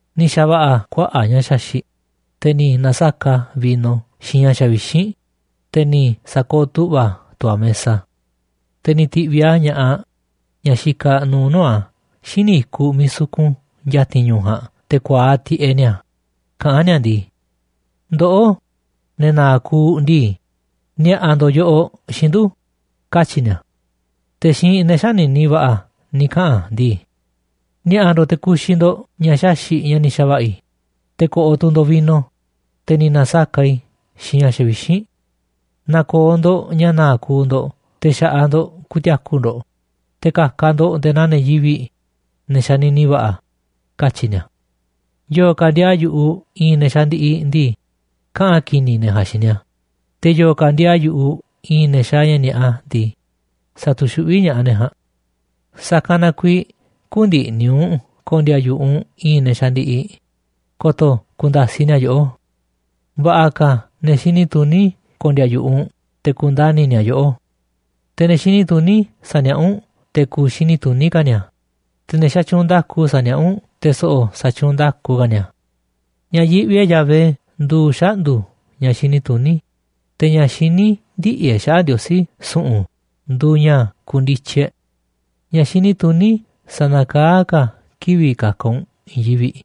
Ni̱ xa̱va̱ꞌa̱ a̱ kuaꞌa̱ꞌ ña̱ xaxi̱ꞌ, te̱ ni̱ na̱saka̱ꞌ a̱ vino xiinꞌ ña̱ xavixínꞌ, te̱ ni̱ sa̱kooꞌ tu̱ꞌva̱ tu̱ a̱ mesa. Te̱ ni̱ ti̱ꞌviꞌ a̱ ña̱ꞌaꞌ ñaꞌ xikaꞌ nuuꞌ nuu̱ꞌ a̱ xíniꞌ i̱kuꞌ miiꞌ sukun ya̱ti̱n ñu̱u̱ ja̱a̱nꞌ, te̱ ku̱a̱aꞌ tiꞌeꞌ ni̱a̱, kaꞌa̱n ni̱a̱ ndii: “Ndoꞌó, ne̱ na̱a̱ꞌ kuuꞌ ndii, ni̱a̱ꞌa̱ ndo̱ꞌ yoꞌoꞌ xiinꞌ ndu̱”, katyi̱ ni̱a̱. Te̱ xiinꞌ ne̱ xänini va̱ꞌa̱ ni̱ kaꞌa̱n a̱ ndii: “Ni̱a̱ꞌa̱ ndo̱ꞌ te̱ ku̱xi̱ ndo̱ꞌ ña̱ xaxi̱ꞌ ña̱ ni̱ xa̱va̱ꞌa̱ i̱, te̱ ko̱ꞌo̱ tu̱ ndo̱ꞌ vino, te̱ ni̱ na̱saka̱ꞌ i̱ xiinꞌ ña̱ xavixínꞌ. Na̱ko̱o̱ ndo̱ꞌ ña̱ na̱a̱ꞌ kuuꞌ ndo̱ꞌ te̱ xa̱ꞌaꞌ ndo̱ꞌ ku̱ti̱a̱ku̱ ndo̱ꞌ, te̱ ka̱ka̱ ndo̱ꞌ nde̱e̱ naa ne̱ yivi̱ꞌ, ne̱ xanini va̱ꞌa̱”, katyi̱ ni̱a̱. Yo̱o̱ ka̱ ndiaa yu̱ꞌuꞌ i̱i̱n ne̱ xandiꞌiꞌ ndii, kaꞌa̱n ki̱ni̱ ne̱ ja̱a̱nꞌ xiinꞌ ni̱a̱, te̱ yo̱o̱ ka̱ ndiaa yu̱ꞌuꞌ i̱i̱n ne̱ xaaꞌ ña̱ ni̱a̱ꞌa ndii, sa̱tu̱xuꞌví ña̱ꞌaꞌ ne̱ ja̱a̱nꞌ. Sa̱kanꞌ na kuiiꞌ kü̱ndi̱ꞌni̱ u̱nꞌ ko̱ndi̱a̱ yu̱ꞌuꞌ i̱i̱n ne̱ xandiꞌiꞌ, ko̱to̱ ku̱nda̱siꞌ ni̱a̱ yoꞌó. Va̱ꞌa̱ ka̱ ne̱ xini tuní ko̱ndi̱a̱ yu̱ꞌuꞌ u̱nꞌ te̱ ku̱ndani̱ ni̱a̱ yoꞌó. Te̱ ne̱ xini tuní sa̱niaꞌá u̱nꞌ te̱ ku̱u̱ xini tuní ka̱ ni̱a̱, te̱ ne̱ xatyuunꞌ nda̱ku sa̱niaꞌá u̱nꞌ te̱ so̱ꞌo̱ sa̱tyuunꞌ nda̱ku ka̱ ni̱a̱. Ña̱ yiꞌvi e̱ꞌ Yahvé nduuꞌ xaꞌndu̱ ña̱ xini tuní, te̱ ña̱ xiní ndiꞌi̱ e̱ꞌ xaꞌa̱ꞌ Ndiosí su̱ꞌu̱n nduuꞌ ña̱ kundityi e̱ꞌ. Ña̱ xini tuní sa̱na̱kaá ka̱ kivi̱ꞌ ka̱ka̱ u̱nꞌ i̱i̱n yivi̱ꞌ,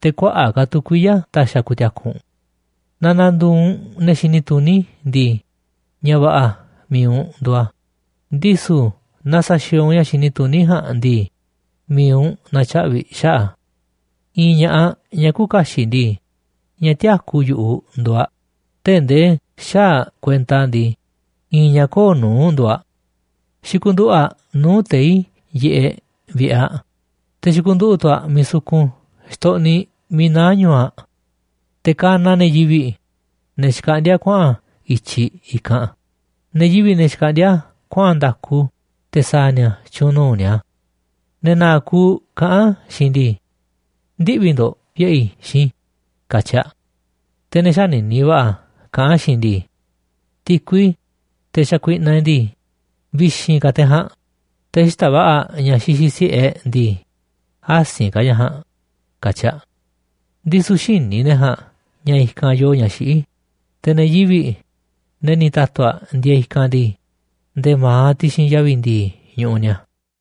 te̱ kuaꞌa̱ꞌ ka̱ tu̱ kuiya̱ ta̱xi̱ a̱ ku̱ti̱a̱ku̱ u̱nꞌ. Naaꞌ na̱ndu̱u̱ u̱nꞌ ne̱ xini tuní ndii, ña̱ va̱ꞌa̱ mi̱iꞌ u̱nꞌ nduuꞌ a̱, ndisu̱ naaꞌ sa̱xi̱o̱o̱ u̱nꞌ ña̱ xini tuní ja̱a̱nꞌ ndii, mi̱iꞌ u̱nꞌ na̱tyaꞌvi̱ xaꞌa̱ꞌ a̱. I̱i̱n ña̱ꞌaꞌ ñaꞌ küuꞌ kaxiꞌ ndii, ñaꞌ tiäkú yu̱ꞌuꞌ nduuꞌ aꞌ, tee̱ꞌ ndee xäaꞌ aꞌ kuenta ndii, i̱i̱n ñaꞌ köo̱ꞌ nuu̱ꞌ nduuꞌ aꞌ. Xikunduꞌu̱ꞌ aꞌ nuu̱ꞌ tei̱ yiꞌeꞌ vi̱ꞌe̱ aꞌ, te̱ xikunduꞌu̱ꞌ tu̱ aꞌ miiꞌ sukun xtoꞌniꞌ miiꞌ naá ñu̱u̱ aꞌ. Te̱ kanaꞌ a̱ ne̱ yivi̱ꞌ, ne̱ xkaꞌndíá kuaꞌa̱n i̱tyiꞌ i̱kanꞌ, ne̱ yivi̱ꞌ, ne̱ xkaꞌndíá kuaꞌa̱n nda̱ku te̱ sa̱a̱ nia̱ tyu̱u̱n nuu̱ꞌ nia̱. Ne̱ na̱a̱ꞌ kuuꞌ kaꞌán aꞌ xiinꞌ ndii: “Ndiꞌvi̱ ndo̱ꞌ vi̱ꞌe̱ i̱ xiinꞌ i̱”, katyi aꞌ. Te̱ ne̱ xänini va̱ꞌa̱ kaꞌán aꞌ xiinꞌ ndii: “Ti̱kui, teꞌ xakuiꞌnaꞌ e̱ꞌ ndii, vi̱xi̱n ka̱ teꞌ ja̱a̱nꞌ, te̱ xita̱ꞌ va̱ꞌa̱ ña̱ xixiꞌ si̱ꞌe e̱ꞌ ndii, asi̱nꞌ ka̱ ña̱ ja̱a̱nꞌ”, katyi aꞌ. Ndisu̱ xïní ne̱ ja̱a̱nꞌ ña̱ i̱kanꞌ yoo ña̱ xiꞌí, te̱ ne̱ yivi̱ꞌ, ne̱ ni̱ ta̱tu̱ aꞌ ndieeꞌ i̱kanꞌ ndii, nde̱e̱ ma̱aꞌ ti̱xi̱n yavi̱ ndi̱i̱ ñuꞌuꞌ ni̱a̱.